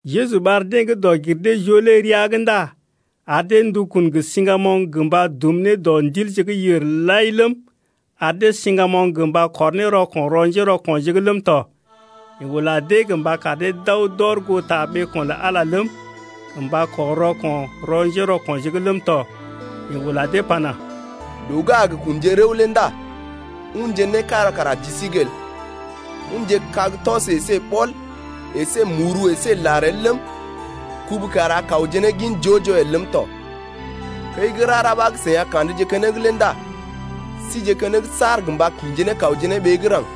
Jeju ɓar deḛ gə́ dɔg-gir-dee-joo lé rəa’g ndá ar dee ndukun gə siŋgamoŋ gə mba dum ne dɔ ndilje gə́ yèr lai ləm, ar dee siŋgamoŋ gə mba kɔr ne rɔko̰ rɔ njérɔko̰je’g ləm tɔ. Yeḛ ula dee gə mba kar dee d’aw d’ɔr goo ta ɓeeko̰ lə Ala ləm, gə mba kɔr rɔko̰ rɔ njérɔko̰je’g ləm tɔ. Yeḛ ula dee pana: Loo gə́ a gə kunje rəw lé ndá unje né kára kara ji sí’g el, unje kag tɔs əsé ɓɔl əsé muru əsé lar el ləm, kubu kara kawje ne gin joo-joo el ləm tɔ. Kəi gə́ rara ɓa gə́ seḭ a ka̰dje keneŋ lé ndá sije keneŋ saar gə mba kḭje ne kawje ne ɓee gə́ raŋg.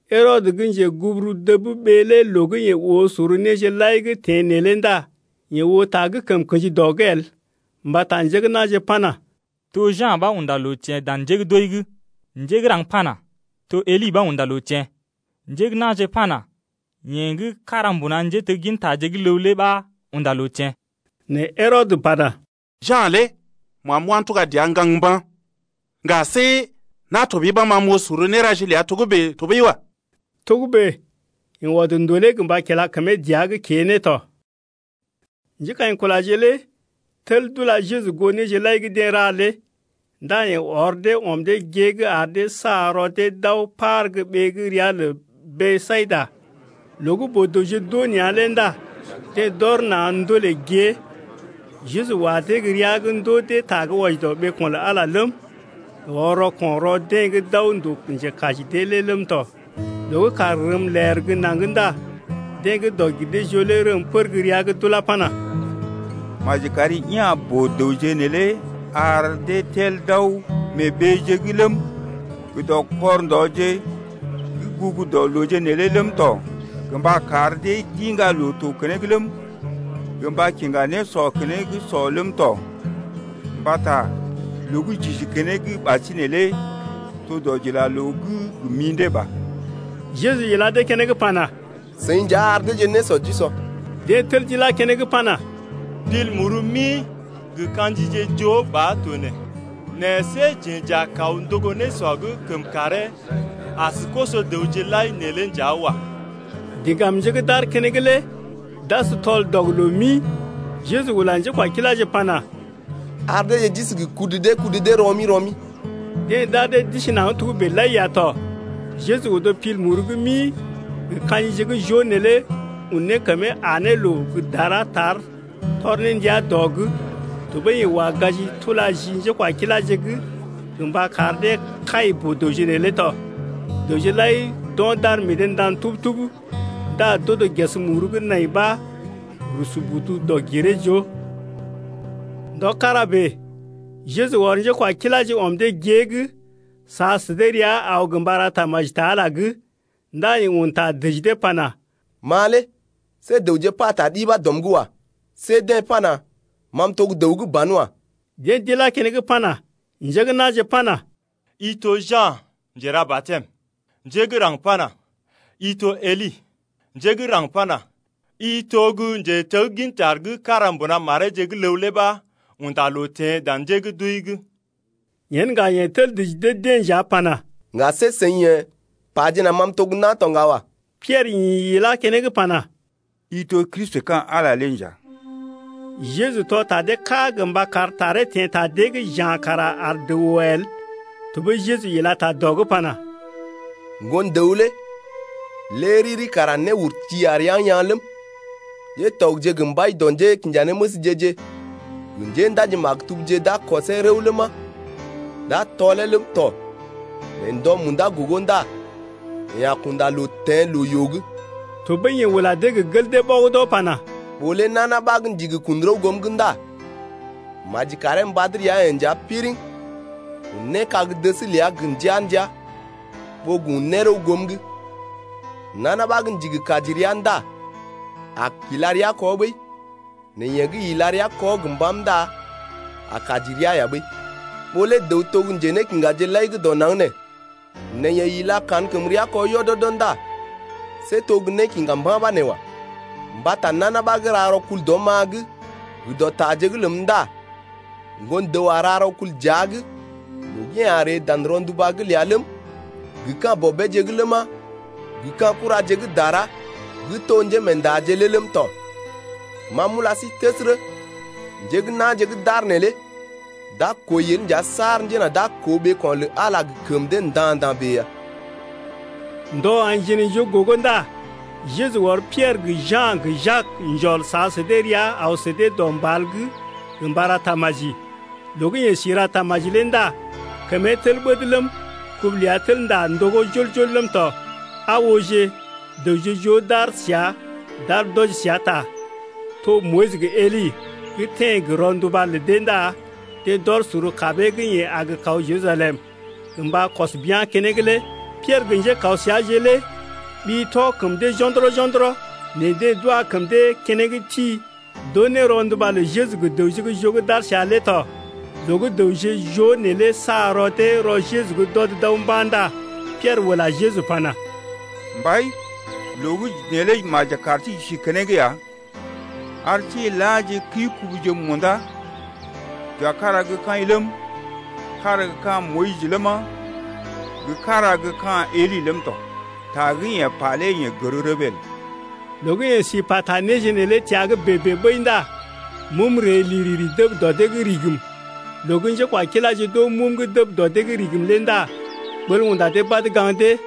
Herɔdə gə́ njeguburu dəb ɓee lé loo gə́ yeḛ oo sor néje lai gə́ teḛ neelé ndá yeḛ oo ta gə́ kəm kḛji dɔ’g el. Mbata njé gə́ na̰je pana: To Ja̰ ɓa unda loo teḛ dan njé gə́ d’wəi’g. Njé gə́ raŋg pana: To Eli ɓa unda loo teḛ. Njé gə́ na̰je pana: Yeḛ gə́ kára mbuna njéteggintaje gə́ ləw lé ɓa unda loo teḛ. Nɛ Herɔdə pana: Ja̰ lé ma m’wá m’tuga dəa m’gaŋg mba̰. Ŋga see na̰ tɔɓəi ɓa ma m’oo sor néraje ləa togə́bè tɔɓəi wa. Togə́bè yeḛ ɔd ndolee gə mba kila kəmee dəa’g kée ne tɔ. Njékaḭkulaje lé tel d’ula Jeju goo néje lai gə́ deḛ ra lé. Ndá yeḛ ɔr dee ɔm dee gée’g ar dee sa rɔ dee d’aw par gə́ ɓee gə́ ria lə Besayida. Loo gə́ boo-dəwje d’oo nea̰ lé ndá deḛ d’ɔr na̰ ndolè gée. Jeju wa dee gə́ rəa’g ndoo dee ta gə́ wɔji dɔ ɓeeko̰ lə Ala ləm, yeḛ ɔr rɔko̰ rɔ deḛ gə́ d’aw ndòo njekaji dee lé ləm tɔ. Loo gə́ kàr rəm ler gə́ naŋg ndá deḛ gə́ dɔg-gir-dee-joo lé rəm pər gə́ rəa’g d’ulá pana: Maji kari ya̰ boo-dəwje neelé ar dee tel d’aw mee ɓeeje’g ləm, gə dɔ kɔr ndɔje gə́ gugu dɔ loo neelé ləm tɔ gə mba kar dee d’iŋga loo-to keneŋ ləm, gə mba kiŋga nésɔ keneŋ sɔ ləm tɔ. Mbata loo gə́ j’isi keneŋ ɓasinè lé to dɔdilaloo’g gə mḭdé ba. Jeju ila dee keneŋ pana: Seḭ nja ar deeje nésɔ d’usɔ. Deḛ tel d’ilá keneŋ pana, Pil muru mi gə ka̰jije joo ba to nee. Nɛ see jeḛ nja j’a kaw ndogo nésɔ gə́ kəm karee as koso-dəwje lai neelé nja wa. Diŋgamje gə́ d’aar keneŋ lé d’as tɔl-dɔg-loo-mi. Jeju ula njékwakiláje pana: Ar deeje d’isi gə kudu dee kudu dee rɔ-mi rɔ-mi. Deḛ d’ar dee d’isi naŋg togə́bè lai ya tɔ. Jeju odo pil muru gə́ mi gə ka̰jije gə́ joo neelé un ne kəmee aa ne loo gə́ dara tar tɔr ne ndia dɔ’g. Tɔɓəi yeḛ wa gaji, tula ji njékwakiláje’g gə mba kar dee kai boo-dəwje neelé tɔ. Dəwje lai d’o̰ d’ar meḛ dee ndan tub-tub ndá d’odo ges muru gə́ nai ɓa rusu budu dɔg-giree-joo. Ndɔ kára bèe Jeju ɔr njékwakiláje ɔm dee gée’g sa sə dee rəa aw gə mba ra tamaji ta Ala’g. Ndá yeḛ un ta dəji dee pana: Ma lé see dəwje pata ɗi ɓa dɔm’g wa. See deḛ pana: Ma m’to gə́ dəw gə́ banwa. Deḛ d’ilá keneŋ pana: I to Ja̰ Njera-batɛm. Njé gə́ raŋg pana: I to Eli. Njé gə́ raŋg pana: I to gə́ njetegginta gə́ kára gə́ mbuna mareeje gə́ ləw lé ɓa unda loo teḛ dan njé gə́ d’wəi’g. Yen ŋga yeḛ tel dəji dee-deḛ nja pana, ŋga see seḭ yḛ̀ pajena ma m’to gə́ na̰ to ŋga wa. Piɛrə ḭ ilá keneŋ pana: I to Kristi ka̰ Ala lé nja. Jeju tɔ ta dee ká gə mba kar taree teḛ ta dee’g ja̰ kara ar dəw oo el. Tɔɓəi Jeju ila ta dɔ’g pana: Ŋgon-dəw lé lé riri kara néurti a rəa yaa̰ ləm, ŋgatɔgje gə mbai dɔ njékinjanéməsje-je gə njéndaji-maktubje d’a kɔsee rəw ləma, d’a tɔlee ləm tɔ nɛ ndɔ munda gogo ndá yeḛ a kunda loo teḛ loo-yoo’g. Tɔɓəi yeḛ ula dee gə gel dee ɓɔgədɔ pana: Ɓó lé nana ɓa gə́ ndigi kun rəw goom’g ndá maji karee mbad rəa-yeḛ nja piriŋ un ne kag-dəs ləa gə ndəa-ndəa, ɓó gə un ne rəw goom’g. Nana ɓa gə́ ndigi kaji rəa ndá a kila rəa kɔ ɓəi, nɛ yeḛ gə́ ila rəa kɔ gə mbàm ndá a kaji rəa ya ɓəi. Ɓó lé dəw to gə́ njénékiŋgaje lai gə́ dɔ naŋg nee nɛ yeḛ ila kankəmrea kɔ yɔdɔdɔ ndá see to gə́ nékiŋga mba̰ ɓa nee wa. Mbata nana ɓa gə́ ra rɔkul dɔm-ma’g gə dɔ taje’g ləm ndá Ŋgon-dəw a ra rɔkul dəa’g loo gə́ yeḛ a ree dan rɔnduba’g ləa ləm, gə ka̰ Bɔbeeje’g ləma, gə ka̰ kuraje gə́ dara gə́ to njémeendaje’g lé ləm tɔ. Ma m’ula sí təsərə, njé gə́ na̰je gə́ d’aar neelé d’a kwəi el nja saar njena d’a koo ɓeeko̰ lə Ala lé gə kəm dee nda̰-nda̰ bèe ya. Ndɔ aḭ jinaijoo gogo ndá Jeju ɔr Piɛrə gə Ja̰ gə Jak njɔl sa sə dee rəa aw sə dee dɔ mbal’g gə mba ra tamaji. Loo gə́ yeḛ si ra tamaji lé ndá kəmee tel ɓəd ləm, kubu ləa tel ndá ndogó jol-jol ləm tɔ. Aa ooje, dəwje joo d’aar səa d’aar d’wɔji səa ta, to Moyis gə Eli, gə́ teḛ gə rɔnduba lə dee ndá deḛ d’ɔr sor kabee gə́ yeḛ a gə kaw Jerusalem gə mba kɔs bia̰ keneŋ lé. Piɛrə gə njékaw səaje lé ɓi tɔ kəm dee jo̰dɔrɔ-jo̰dɔrɔ, nɛ deḛ d’wa kəm dee keneŋ ti, d’oo ne rɔnduba lə Jeju gə dəwje gə́ joo gə́ d’aar səa lé tɔ. Loo gə́ dəwje joo neelé sa rɔ dee rɔ Jeju’g d’ɔd d’aw mba̰ ndá Piɛrə ula Jeju pana: Mbai, loo gə́ neelé maji kar sí j’isije keneŋ ya, ar sí n’laaje kəi-kubuje munda, j’wa kára gə kaḭ ləm, kára gə́ ka̰ Moyis ləma, gə kára gə́ ka̰ Eli ləm tɔ. Ta gə́ yeḛ pa lé yeḛ gər rəbee el. Loo gə́ yeḛ si pata néje neelé təa’g bèe-bèe ɓəi ndá mum ree liriri dəb dɔ dee’g rigim, loo gə́ njékwakiláje d’oo mum gə́ dəb dɔ dee’g rigim lé ndá ɓəl unda dee badə gaŋg dee.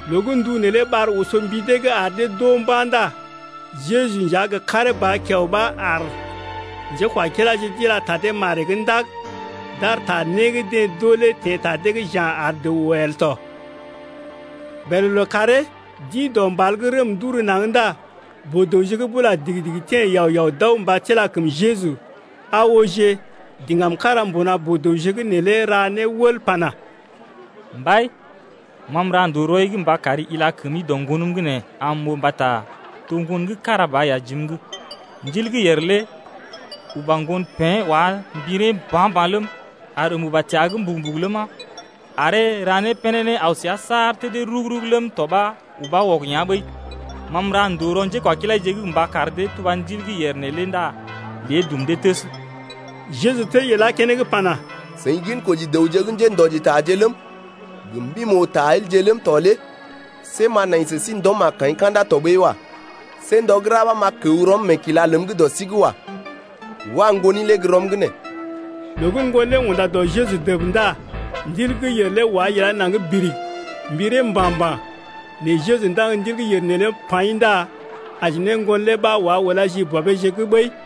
Loo gə́ ndu neelé ɓar oso mbi dee’g ar dee d’oo mba̰ ndá Jeju nja gə karee ba kiao ɓa aar. Njékwakiláje d’ila ta dee maree’g ndag d’ar ta né gə́ deḛ d’oo lé teḛ ta dee’g ja̰ ar dəw oo el tɔ. Bèlè lookàree d’ḭ dɔ mbal’g rəm d’uru naŋg ndá boo-dəwje gə́ bula digi-digi teḛ yao-yao d’aw mba tila kəm Jeju. Aa ooje, diŋgam kára mbuna boo-dəwje’g ra ne wəl pana: Mbai, ma m’ra ndòo rɔi’g mba kari ila kəmi dɔ ŋgonəm’g nee, am m’oo mbata to ŋgon gə́ kára ba ya jim’g. Ndil gə́ yèr lé uba ŋgon pḛ́ wá mbiree mba̰-mba̰ ləm, ar əm uba təa’g mbugu-mbugu ləma, aree ra né pénéné aw səa saar tədee rug-rug ləm tɔ ɓa ubá wɔg yá̰ ɓəi. Ma m’ra ndòo rɔ njékwakilaije’g gə mba kar dee tuba ndil gə́ yèr neelé ndá lé dum dee təs. Jeju tel ilá keneŋ pana: Seḭ ginkoji dəwje gə́ njéndɔjitaje ləm, gə mbim-oo-ta-elje ləm tɔ lé see m’a nai sə sí ndɔm ka̰da tɔɓəi wa. See ndɔ gə́ ra ɓa m’a kəw rɔm meekila ləm gə́ dɔ sí’g wa. Wa ŋgoni lé gə́ rɔm’g nee. Loo gə́ ŋgon lé unda dɔ Jeju dəb ndá ndil gə́ yèr lé wá ilá naŋg birig, mbiree mba̰-mba̰. Nɛ Jeju ndaŋg ndil gə́ yèr neelé paḭ ndá aji ne ŋgon lé ɓa wá ulá ji bɔbeeje’g ɓəi.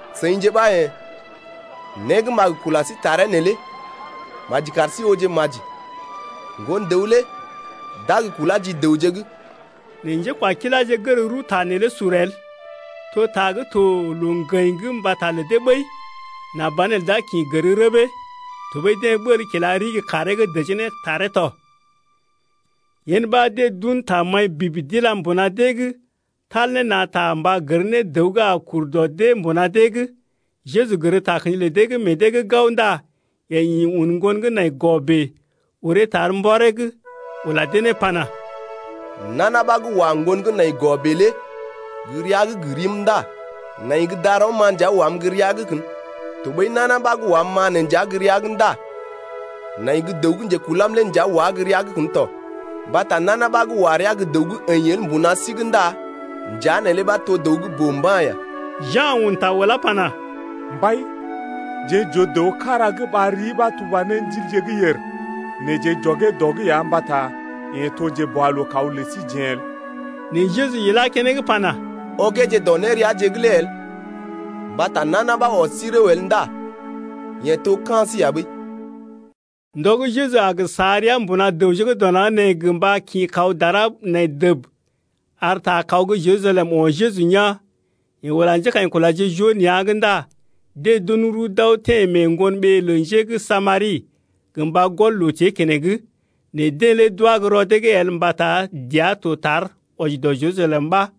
Seḭje ɓa yḛ̀, né gə́ m’a gə kula sí taree neelé maji kar sí ooje maji. Ŋgon-dəw lé d’a gə kulá ji dəwje’g. Nɛ njékwakiláje gər rəw ta neelé sur el, to ta gə́ to loo-ŋgəḭ’g mbata lə dee ɓəi, nà banelə d’a kḭ gər rəbee. Tɔɓəi deḛ ɓəl kila ɗigi kaaree’g dəjee ne taree tɔ. Yen ɓa deḛ d’un tamaḭ bib d’ila mbuna dee’g tal ne na̰ ta mba gər ne dəw gə́ a kur dɔ dee mbuna dee’g. Jeju gər takə̰ji lə dee gə́ meḛ dee’g gao ndá yeḛ ḭ un ŋgon gə́ nai gɔ bèe, uree tar mbɔree’g ula dee ne pana: Nana ɓa gə́ wa ŋgon gə́ nai gɔ bèe lé gə́ rəa’g gə rim ndá nai gə́ darɔm-ma nja wam gə́ rəa’g kən, tɔɓəi nana ɓa gə́ wam-ma nee nja gə́ rəa’g ndá nai gə́ dəw gə́ njekulam lé nja wá gə́ rəa’g kən tɔ. Mbata nana ɓa gə́ wa rəa’g gə́ dəw gə́ əḭ el mbuna sí’g ndá njea neelé ɓa to dəw gə́ boo mba̰ ya. Ja̰ un ta ulá pana: Mbai, jeḛ j’oo dəw kára gə́ ɓar rii ɓa tuba ne ndilje gə́ yèr, nɛ jeḛ j’ɔgee dɔ’g ya mbata yeḛ to gə́ njeboalookaw lə síjeḛ el. Nɛ Jeju ilá keneŋ pana: Ɔgeeje dɔ néreaje’g lé el, mbata nana ɓa gə́ ɔs sí rəw el ndá yeḛ to ka̰ sí ya ɓəi. Ndɔ gə́ Jeju a gə sa rəa mbuna dəwje gə́ dɔ naŋg nee gə mba kḭ kaw dara nai dəb, ar ta kaw gə́ Jerusalem o̰ Jeju yaa̰. Yeḛ ula njékaḭkulaje joo nea̰’g ndá deḛ d’un rəw d’aw teḛ mee ŋgon ɓee lə njé gə́ Samari, gə mba gɔl loo-tée keneŋ. Nɛ deḛ lé d’wá gə́ rɔ dee’g el mbata dəa to tar wɔji dɔ Jerusalem ɓa.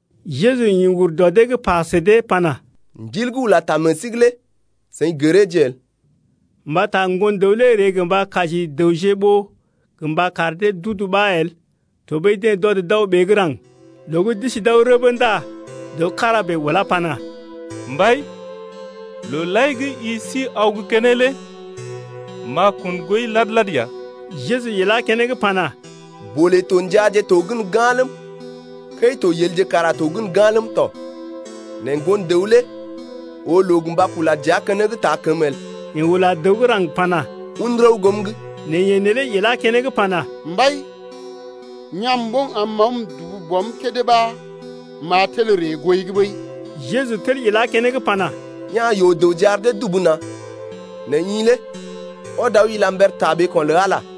Jeju ḭ ur dɔ dee’g pa sə dee pana: Ndil gə́ ula ta meḛ sí’g lé seḭ gəreeje el. Mbata Ŋgon-dəw lé ree gə mba kaji dəwje ɓó gə mba kar dee d’udu ɓa el. Tɔɓəi deḛ d’ɔd d’aw ɓee gə́ raŋg. Loo gə́ d’isi d’aw rəbə ndá dəw kára bèe ulá pana: Mbai, loo lai gə́ i si aw gə́ keneŋ lé m’a kun gooi lad-lad ya. Jeju ilá keneŋ pana: Bolé to njaaje to gən ga̰ ləm, kəi-to yelje kara to gən ga̰ ləm tɔ, nɛ Ŋgon-dəw lé oo loo gə mba kula dəa keneŋ taa kəmə el. Yeḛ ula dəw gə́ raŋg pana: Un rəw goom’g. Nɛ yeḛ neelé ilá keneŋ pana: Mbai, ya̰’m ɓoŋ am m’aw m’dubu bɔm kédé ɓa m’a tel ree gooi’g ɓəi. Jeju tel ilá keneŋ pana: Ya̰ yoo-dəwje ar dee dubu na̰. Nɛ i lé ɔd aw ila mber ta ɓeeko̰ lə Ala.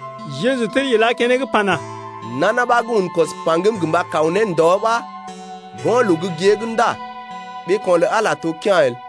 Jeju tel ilá keneŋ pana: Nana ɓa gə́ un kwɔs paŋgəm gə mba kaw ne ndɔ ɓa go̰ loo gə́ gée’g ndá ɓeeko̰ lə Ala lé to kea̰ el.